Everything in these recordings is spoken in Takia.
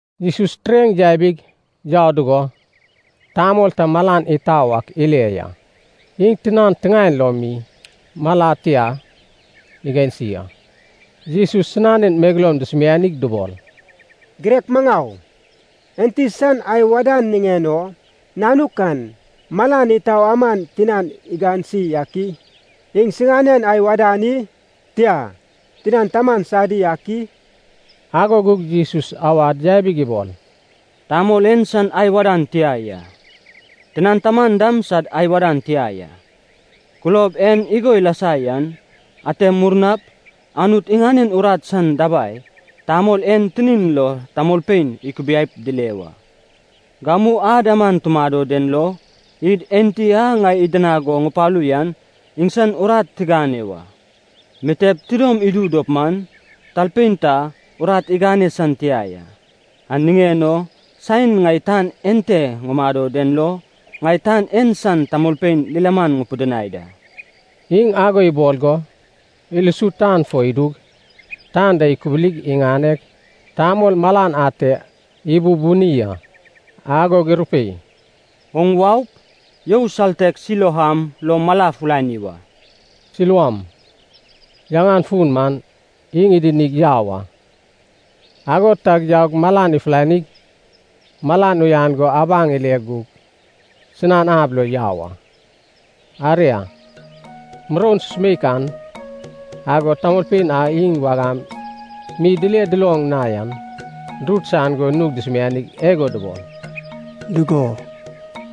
Jesus tureŋ yabig yau dugo, tamol ta malan itau ak ile ya. Iŋ tinan tiŋaen lo mi mala tia igansi a. Jesus sinanen megeloum dusumianig dubol, “Girek maŋau, enti san ai wadan niŋen o nanuk an malan itau aman tinan igansi ak i? Iŋsinanen ai wadan i? Tia, tinan taman sadi ak i?” Ago gug Jesus awad yabig ibol, “Tamol en san ai wadan tia ya, tinan taman dam sad ai wadan tia ya. Kulob en igo ilasa yan, ate murnap Anut iŋanen urat san dabai tamol en tinin lo tamolpein ikubiaip dile wa. Gamu ad aman tumado den lo, id Enti a ŋai idinag go ŋupalu yan iŋsan urat tigane wa. Mitep tidom idu dop man, talpein ta urat igane san tia ya. An niŋen o saen ŋai tan ente ŋumado den lo, ŋai tan en san tamolpein lilaman ŋupidinai da.” Iŋ ago ibol go, ilusu tan fo idug, tan da ikubulig iŋaneg, tamol malan ate ibubuni a. Agog irupei, “Oŋ waup, you saltek Siloam lo mala fulani wa.” (Siloam yaŋan fun man: iŋ idinig yau a.) Ago tag yaug malan ifulanig, malan uyan go abaŋ ile gug sinan ab lo yau a. Aria, muroun susumeik an, agod tamolpein a iŋ wagam mi dile duloŋ na yan durut saian go nug dusumianig igo dubol, “Dugo,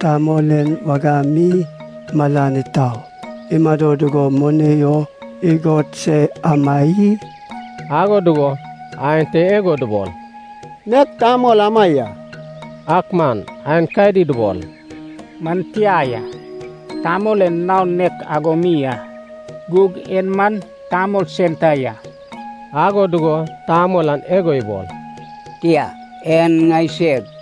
tamol en wagam mi malan itau imado dugo moni o igod se ama i?” Ago dugo aenta igo dubol, “Nek tamol ama ya.” Ak man aenkadi dubol, “Man tia ya, tamol en naon nek ago mi a, gug en man tamol sen ta ya.” Ago dugo tamol an igo ibol, “Tia, en ŋaiseg.”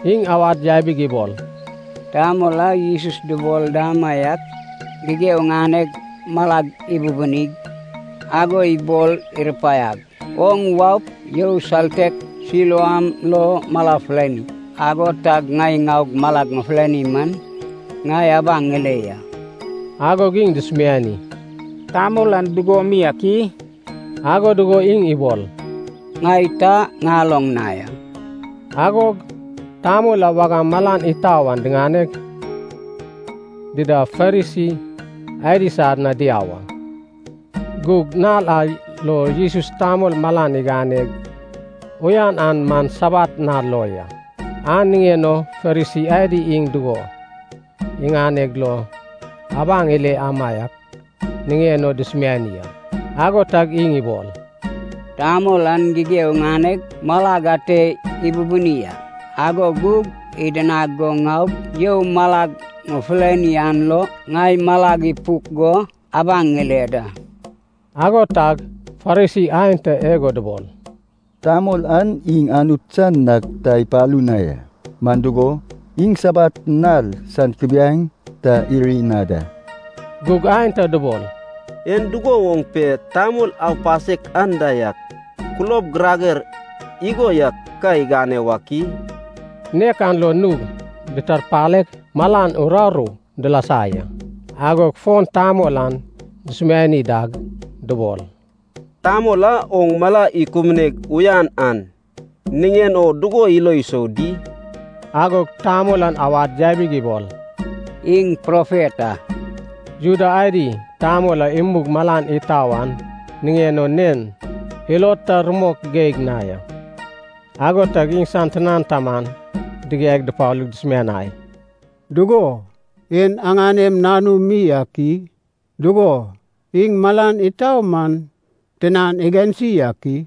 Iŋ awad yabig ibol, “Tamol a Jesus dubol damaiak gigeo iŋaneg malag ibubunig ago ibol irupaiag, ‘Oŋ waup, you saltek Siloam lo mala fulani.’ Ago tag ŋai ŋaug malag ŋufulani man, ŋai abaŋ ŋile ya.” Agog iŋ dusumiani, “Tamol an dugo mi ak i?” Ago dugo iŋ ibol, “Ŋai ta ŋaloŋ na ya.” Agog tamol a wagam malan itau an diŋaneg, dida Farisi adi sad na diau a. Gug nal a lo Jesus tamol malan iganeg uyan an man Sabat nal lo ya. An niŋen o Farisi adi iŋ dugo iganeg lo abaŋ iled amaiak niŋen o dusumiani a. Ago tag iŋ ibol, “Tamol an gigeo iŋaneg malag ate ibubuni a, ago gug idinag go ŋaug you malag ŋufulani an lo ŋai malag ipuk go abaŋ ŋile da.” Ago tag Farisi aenta igo dubol, “Tamol an iŋ Anut san nag ta ipalu na ya, man dugo, iŋ Sabat nal san kubiaeŋ ta iri na da.” Gug aenta dubol, “En dugo woŋ pe tamol aupasek anda yak kulob girager igo yak ka igane wak i?” Nek an log nug ditarpaleg malan uraru dilasa ya. Agog fon tamol an dusumiani dag dubol, “Tamol a oŋ mala ikubuneg uyan an niŋen o dugo ilo isou di?” Agog tamol an awad yabig ibol, “Iŋ profet a.” Juda adi tamol a imug malan itau an niŋen o nen ilod ta rumok geig na ya. Ago tag iŋsan tinan taman digiaig dupalug dusumianai, “Dugo, en aŋanem nanum mi ak i? Dugo, iŋ malan itau man tinan igansi ak i?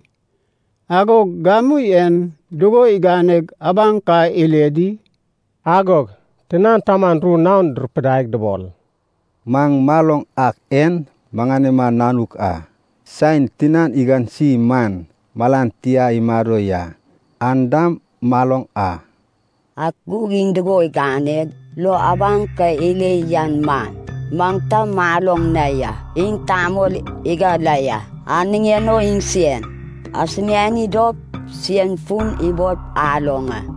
Agog gamu en dugo iganeg abaŋ ka ile di?” Agog tinan taman ru naon durupidaig dubol, “Maŋ maloŋ ak en maŋanema nanuk a. Saen tinan igansi man malan tia imado ya, an dam maloŋ a. Ak gug iŋ dugo iganeg lo abaŋ ka ile yan man maŋ ta maloŋ na ya. Iŋ tamol igane la ya, an niŋen o iŋsen asumiani dop, sen fun ibol aloŋ a.”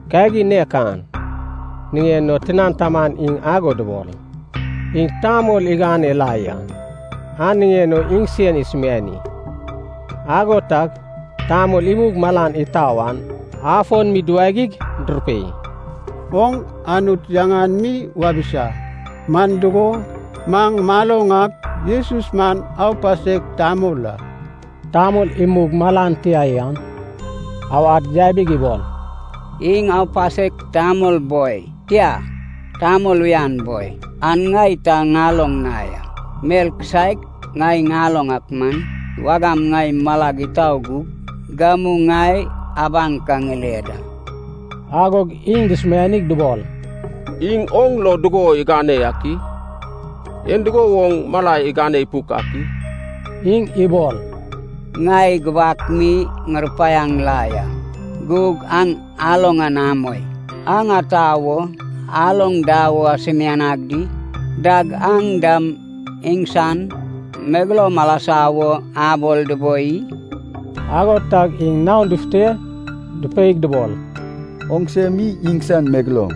Kagin nek an niŋen o tinan taman iŋ ago dubol, “Iŋ tamol igane la ya, an niŋen o iŋsen asumiani.” Ago tag tamol imug malan itau an afon mi duwagig durupei, “Oŋ Anut yaŋan mi wabisa. Man dugo, maŋ maloŋ ak, Jesus man aupasek tamol a.” Tamol imug malan tia an awad yabig ibol, “Iŋ aupasek tamol boi, tia, tamol uyan boi, an ŋai ta ŋaloŋ na ya. Mel kisaek ŋai ŋaloŋ ak man, wagam ŋai malag itau gug, gamu ŋai abaŋ ka ŋile da!” Agog iŋ dusumianig dubol, “Iŋ oŋ lo dugo igane yak i? En dugo woŋ mala igane ipuk ak i?” Iŋ ibol, “Ŋai gubak mi ŋurupaiaŋ la ya, gug aŋ aloŋ an amoi. Aŋ ata wo aloŋ da wo asumianag di? Dag aŋ dam iŋsan megeloum alasa wo abol duboi i?” Ago tag iŋ naon dufute dupeig dubol, “Oŋse mi iŋsan megeloum,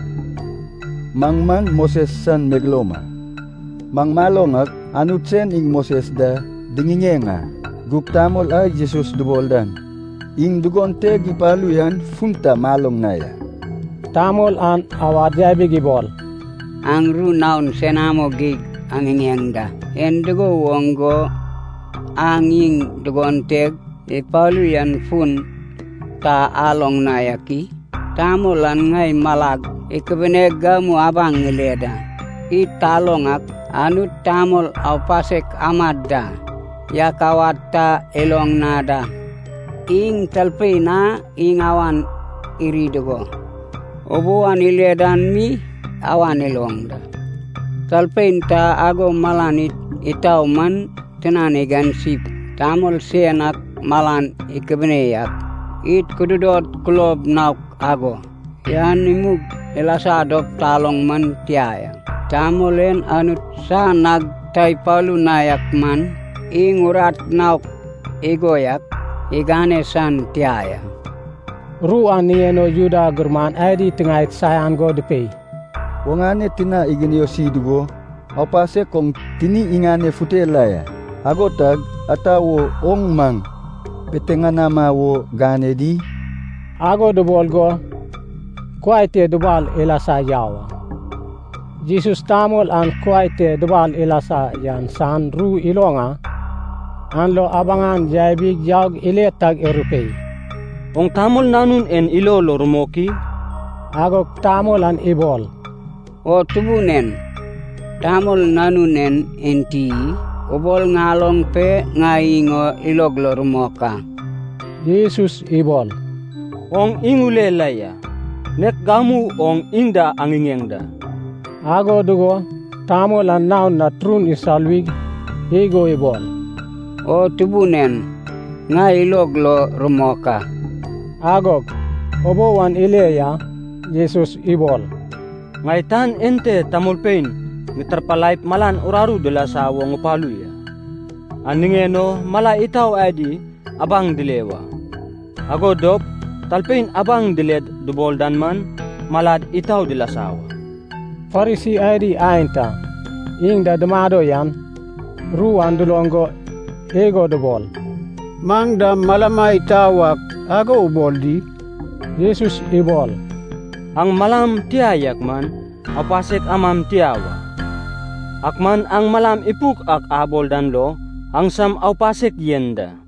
maŋ man Moses san megeloum a! Maŋ maloŋ ak Anut sen iŋ Moses da diŋiŋeŋ a. Gug tamol a Jesus dubol dan iŋ dugon teg ipalu yan fun ta maloŋ na ya.” Tamol an awad yabig ibol, “Aŋ ru naon senamo geig aŋiŋeŋ da! En dugo woŋ go aŋ iŋ dugon teg ipalu yan fun ta aloŋ na yak i? Tamol an ŋai malag ikubuneg gamu abaŋ ŋile da. Id taloŋ ak, Anut tamol aupasek amad da yak awad ta iloŋ na da. Iŋ talpein a iŋ awan iri dugo, ubou an ile dan mi awan iloŋ da. Talpein ta ago malan itau man tinan igansip, tamol sen ak malan ikubune yak, id kududod kulob naok ago yan imug ilasa dop taloŋ man tia ya. Tamol en Anut san nag ta ipalu na yak man, iŋ urat naok igo yak igane san tia ya.” Ru an niŋen o Juda gurman adi tiŋaed saian go dupei, “Oŋane tina iginiosi dugo, aupasek oŋ tini iŋanefute la ya! Ago tag, ata wo oŋ maŋ piteŋanama wo gane di?” Ago dubol go kuai te dubal ilasa yau a. Jesus tamol an kuai te dubal ilasa yan san ru iloŋ a. An lo abaŋ an yabi yaug ile tag irupei, “Oŋ Tamol Nanun en ilo lo rumok i?” Agog tamol an ibol, “O Tubun en, Tamol Nanun en enti i? Ubol ŋaloŋ pe, ŋai iŋ o ilog lo rumok a.” Jesus ibol, “Oŋ iŋ ule la ya. Nek gamu oŋ iŋ da aŋiŋeŋ da.” Ago dugo tamol an naon na turun isaluwig igo ibol, “O Tubun en, ŋai ilog lo rumok a.” Agog ubou an ile ya. Jesus ibol, “Ŋai tan ente tamolpein ŋitarpalaip malan uraru dilasa wo ŋupalu ya. An niŋen o mala itau adi abaŋ dile wa, ago dop talpein abaŋ diled dubol dan man, malad itau dilasa wa.” Farisi adi aenta iŋ da dumado yan, ru an duloŋ go igo dubol, “Maŋ dam malama itau ak ago ubol di?” Jesus ibol, “Aŋ malam tia yak man, aupasek amam tia wa. Ak man aŋ malam ipuk ak abol dan lo aŋsam aupasek yen da.”